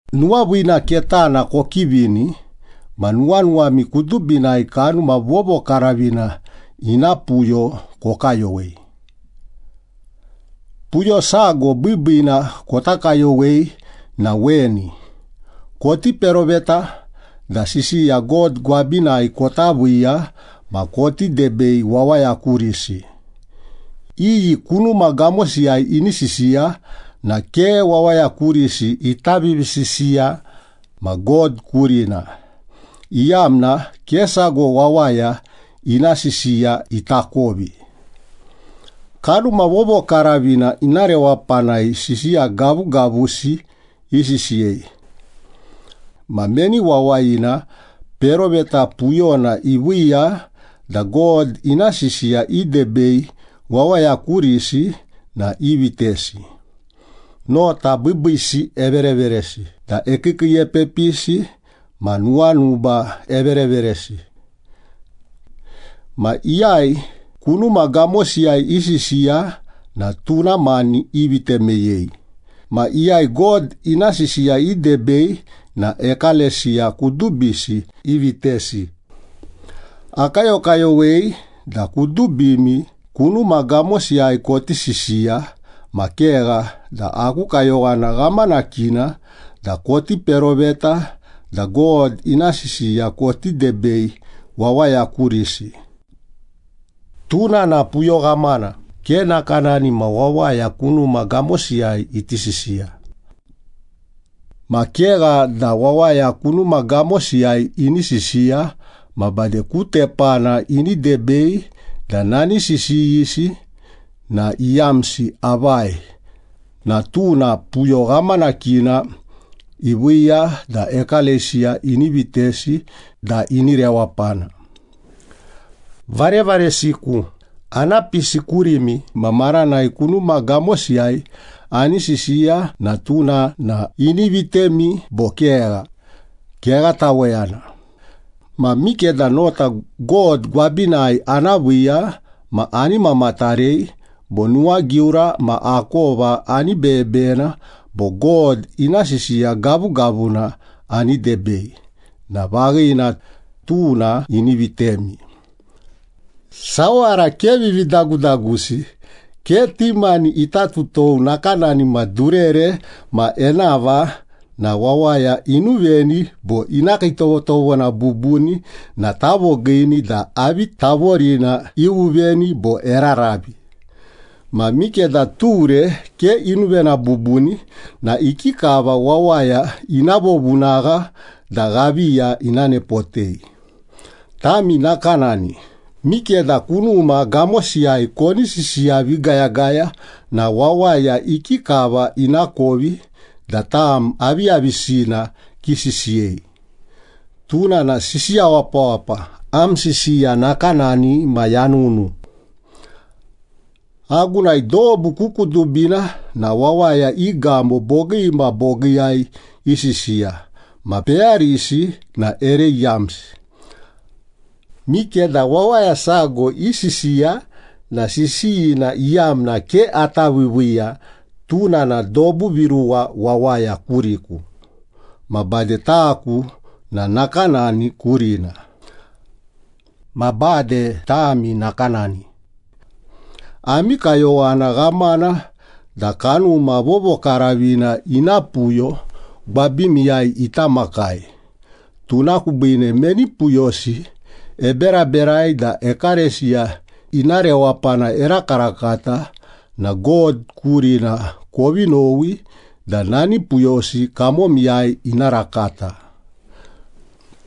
Nuwaviina ketana kokivini ma nuwanuwami kudubinai Kanuma Vovokaravina ina puyo kokayowei. Puyo sago biibiina kota kayowei na weni, koti peroveta da sisiya God gwabinai kota viiya ma koti debei wawaya kurisi. Iyi kunuma gamosiyai ini sisiya na ke wawaya kurisi ita vivisisiya ma God kurina, iyamna ke sago wawaya ina sisiya itakovi. Kanuma Vovokaravina ina rewapanai sisiya gavugavusi isisiyei. Ma meni wawayina peroveta puyona iviiya da God ina sisiya idebei wawaya kurisi na ivitesi, nota biibiisi evereveresi da ekiikiiepepisi ma nuwanuba evereveresi. Ma iyai kunuma gamosiyai isisiya na tuna mani ivite meyei, ma iyai God ina sisiya idebei na ekalesiya kudubisi ivitesi. Akayokayowei da kudubimi kunuma gamosiyai koti sisiya, ma kegha da aku kayowana ghamanakina da koti peroveta da God ina sisiya koti debei wawaya kurisi. Tuna na puyo ghamana, ke nakanani ma wawaya kunuma gamosiyai iti sisiya. Ma kegha da wawaya kunuma gamosiyai ini sisiya ma bade ku tepana ini debei da nani sisiyisi na iyamsi avai na tuna puyo ghamanakina iviiya da ekalesiya ini vitesi da ini rewapana. Varevaresiku, ana pisi kurimi ma maranai kunuma gamosiyai ani sisiya na tuna na ini vitemi bo kegha? Kegha taweyana. Ma mikeda nota God gwabinai ana viiya ma ani mamatarei, bo nuwagiura ma akova ani beyebeyena bo God ina sisiya gavugavuna ani debei, na vaghina, tuna ini vitemi. Sawara ke vividagudagusi, ke ti mani ita tutou nakanani ma durere ma enava na wawaya inuveni bo ina kiitovotovona bubuni na tavogiini da avi tavorina iuvuveni bo eraravi. Ma mikeda ture ke inuvena bubuni na ikikava wawaya ina vovunagha da ghaviya ina nepotei? Tami nakanani, mikeda kunuma gamosiyai koni sisiya vigayagaya na wawaya ikikava inakovi da tam aviyavisina kisisiyei? Tuna na sisiya wapawapa, am sisiya nakanani ma yanunu. Agunai dobu ku kudubina na wawaya i gamo bogii ma bogiiyai isisiya, ma peyarisi na ere iyamsi. Mikeda wawaya sago isisiya na sisiyina iyamna ke ata viiviiya, tuna na dobu viruwa wawaya kuriku, ma bade taku na nakanani kurina. Ma bade tami nakanani. Ami kayowana ghamana da Kanuma Vovokaravina ina puyo gwabimiyai ita makai, tuna kubiine meni puyosi eberaberai da ekalesiya ina rewapana erakarakata na God kurina kovi nowi da nani puyosi kamomiyai ina rakata.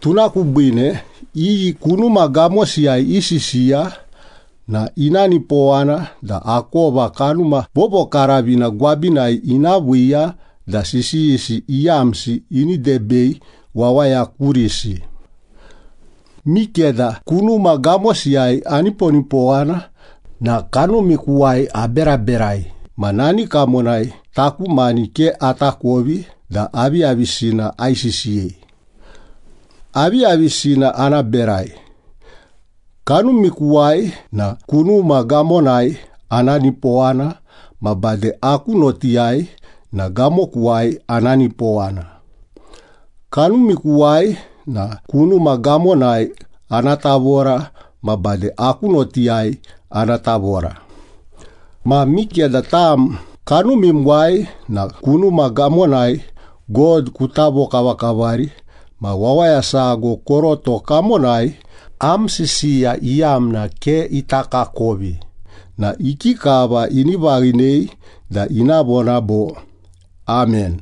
Tuna kubiine, iyi kunuma gamosiyai isisiya na ina nipowana da akova Kanuma Vovokaravina gwabinai ina viiya da sisiyisi iyamsi ini debei wawaya kurisi. Mikeda kunuma gamosiyai aniponipowana na kanumikuwai aberaberai ma nani kamonai taku mani ke atakovi da aviyavisina aisisiyei. Aviyavisina ana berai? Kanumikuwai na kunuma gamonai ana nipowana ma bade aku notiyai na gamokuwai ana nipowana. Kanumikuwai na kunuma gamonai ana tavora ma bade aku notiyai ana tavora. Ma mikeda tam kanumimuwai na kunuma gamonai God kuta vovokavakavari ma wawaya sago koroto kamonai am sisiya iyamna ke itakakovi na ikikava ini vaghinei da ina vona bo, “Amen”?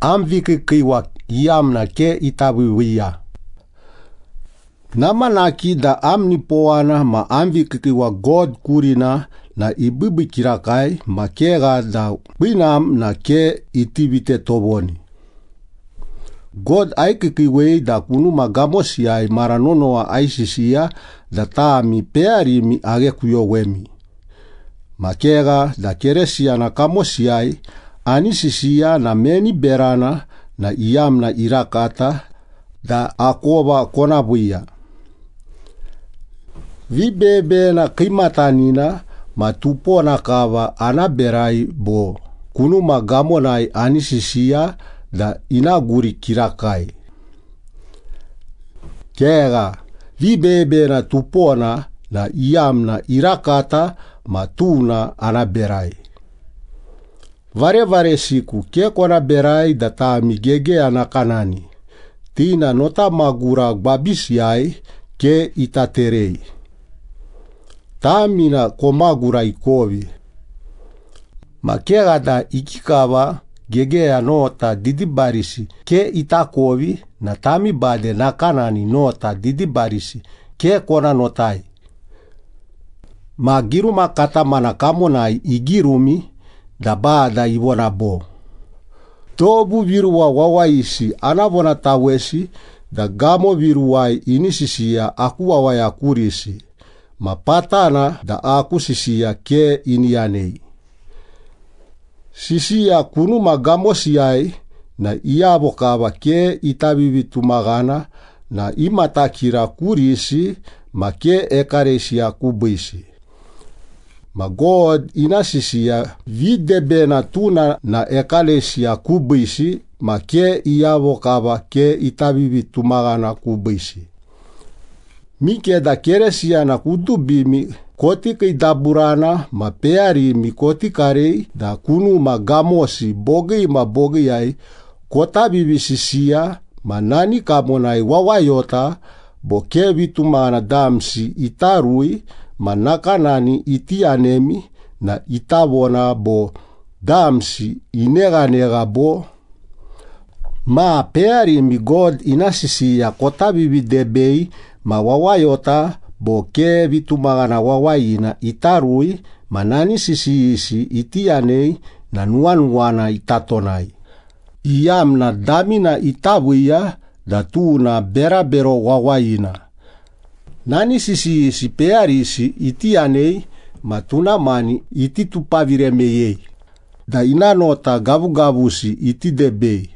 Am vikiikiiwa iyamna ke ita viiviiya. Namanaki da am nipowana ma am vikiikiiwa God kurina na ibiibii kirakai, ma kegha da kwinam na ke iti vite tovoni. God aikiikiiwei da kunuma gamosiyai mara nonowa aisisiya da tami peyarimi aghekuyowemi. Ma kegha da Keresiyana kamosiyai ani sisiya na meni berana na iyamna irakata da akova kona viiya? Vibeyebeyena kiimatanina ma tupona kava ana berai bo kunuma gamonai ani sisiya da ina guri kirakai? Kegha, vibeyebeyena tupona na iyamna irakata ma tuna ana berai. Varevaresiku, ke kona berai da tami gegeya nakanani, ti na notamagura gwabisiyai ke ita terei. Tami na komagura ikovi. Ma kegha da ikikava gegeya nota didibarisi ke itakovi na tami bade nakanani nota didibarisi ke kona notai. Ma giruma katamana kamonai igirumi da Bada ivona bo, “Dobu viruwa wawayisi ana vonatawesi da gamo viruwai ini sisiya aku wawaya kurisi, ma patana da aku sisiya ke ini yanei.” Sisiya kunuma gamosiyai na iyavo kava ke ita vivitumaghana na imatakira kurisi ma ke ekalesiya kubiisi. Ma God ina sisiya videbena, tuna na ekalesiya kubiisi ma ke iyavo kava ke ita vivitumaghana kubiisi. Mikeda Keresiyana kudubimi koti kiidaburana ma peyarimi koti karei da kunuma gamosi bogii ma bogiiyai kota vivisisiya ma nani kamonai wawayota bo ke vitumaghana damsi ita rui ma nakanani iti yanemi na ita vona bo, “Damsi ineghanegha bo?” Ma peyarimi God ina sisiya kota vividebei ma wawayota bo ke vitumaghana wawayina ita rui ma nani sisiyisi iti yanei na nuwanuwana ita tonai, iyamna damina ita viiya da tuna berabero wawayina. Nani sisiyisi peyarisi iti yanei ma tuna mani iti tupavire meyei, da ina nota gavugavusi iti debei.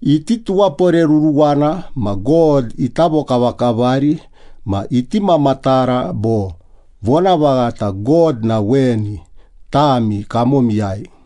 Iti tuwaporeruruwana ma God ita vokavakavari ma iti mamatara bo, “Vonavaghata God na weni, tami kamomiyai.”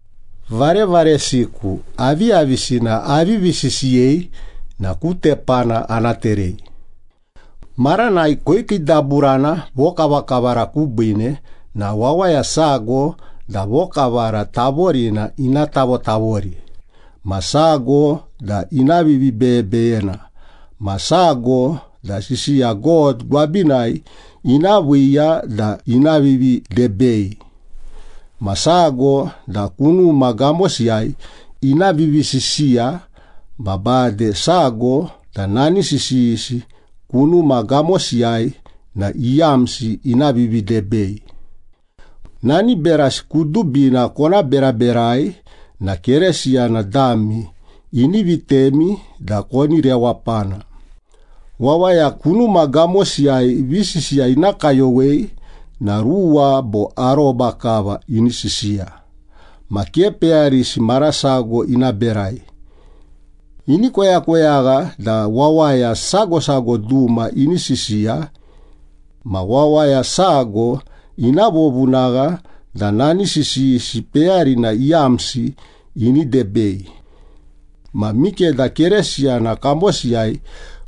Varevaresiku, aviyavisina avivi sisiyei na ku tepana ana terei. Maranai koikiidaburana vokavakavara kubiine na wawaya sago da vokavara tavorina ina tavotavori, ma sago da ina vivibeyebeyena, ma sago da sisiya God gwabinai ina viiya da ina vividebei, ma sago da kunuma gamosiyai ina vivisisiya, ma bade sago da nani sisiyisi kunuma gamosiyai na iyamsi ina vividebei. Nani berasi kudubina kona beraberai na Keresiyana dami ini vitemi da koni rewapana. Wawaya kunuma gamosiyai visisiya ina kayowei na ruwa bo aroba kava ini sisiya. Ma ke peyarisi marasago ina berai. Ini koyakoyagha da wawaya sago sago duma ini sisiya. Ma wawaya sago ina vovunagha da nani sisiyisi peyarina iyamsi ini debei. Ma mikeda Keresiyana kamosiyai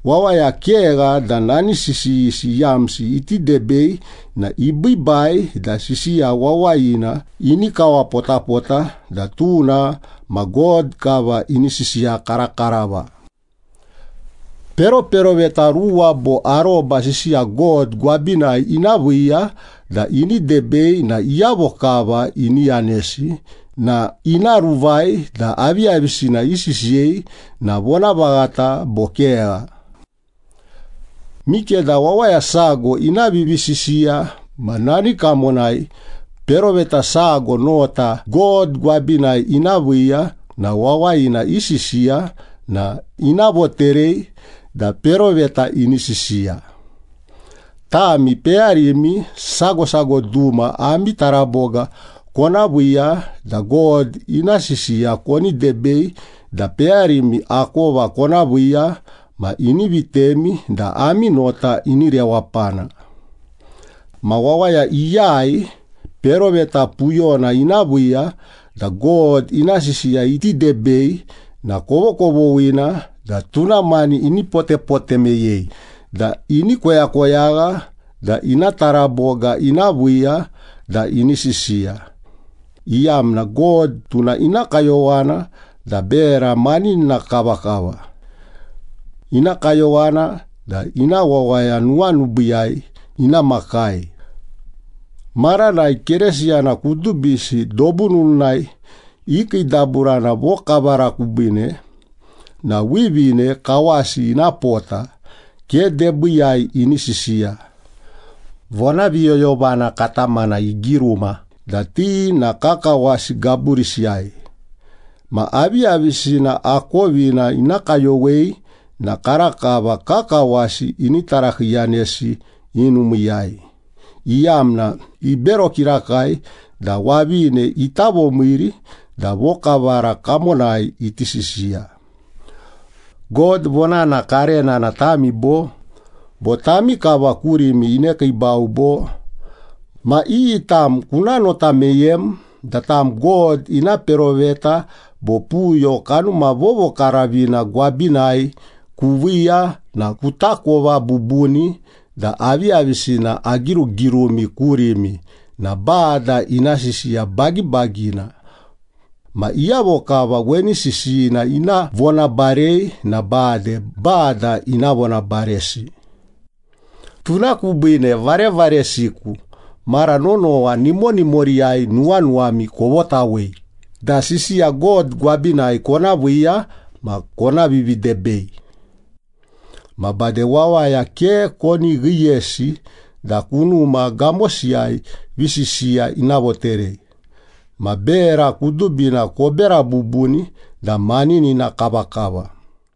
wawaya kegha da nani sisiyisi iyamsi iti debei na ibiibai da sisiya wawayina ini kawapotapota da tuna ma God kava ini sisiya karakarava. Peroperoveta ruwa bo aroba sisiya God gwabinai ina viiya da ini debei na iyavo kava ini yanesi na ina ruvai da aviyavisina isisiyei na vonavaghata bo kegha. Mikeda wawaya sago ina vivisisiya ma nani kamonai peroveta sago nota God gwabinai ina viiya na wawayina isisiya na ina voterei da peroveta ini sisiya. Tami peyarimi sago sago duma ami taraboga kona viiya da God ina sisiya koni debei da peyarimi akova kona viiya ma ini vitemi da ami nota ini rewapana. Ma wawaya iyai peroveta puyona ina viiya da God ina sisiya iti debei na kovokovoghina da tuna mani ini potepote meyei da ini koyakoyagha da ina taraboga ina viiya da ini sisiya, iyamna God tuna ina kayowana da bera maninina kavakava. Ina kayowana da ina wawaya nuwanubiiyai ina makai. Maranai Keresiyana kudubisi dobu nununai ikiidaburana vokavara kubiine na wivine kawasi ina pota, ke debiiyai ini sisiya. Vonaviyoyovana katamana igiruma da ti na kakawasi gaburisiyai. Ma aviyavisina akovina ina kayowei na karakava kakawasi ini tarakiiyanesi i numiiyai, iyamna ibero kirakai da wavine ita vomiiri da vokavara kamonai iti sisiya. God vonana karena na tami bo? Bo tami kava kurimi inekiibau bo? Ma iyi tam kuna nota meyem da tam God ina peroveta bo puyo Kanuma Vovokaravina gwabinai kuviiya na kutakova bubuni da aviyavisina agirugirumi kurimi na Bada ina sisiya bagibagina. Ma iyavo kava weni sisiyina ina vonabarei na bade Bada ina vonabaresi. Tuna kubiine, varevaresiku, mara nonowa nimonimoriyai nuwanuwami kovotawei da sisiya God gwabinai kona viiya ma kona vividebei. Ma bade wawaya ke koni ghiyesi da kunuma gamosiyai visisiya ina voterei. Ma bera kudubina kobera bubuni da maninina kavakava.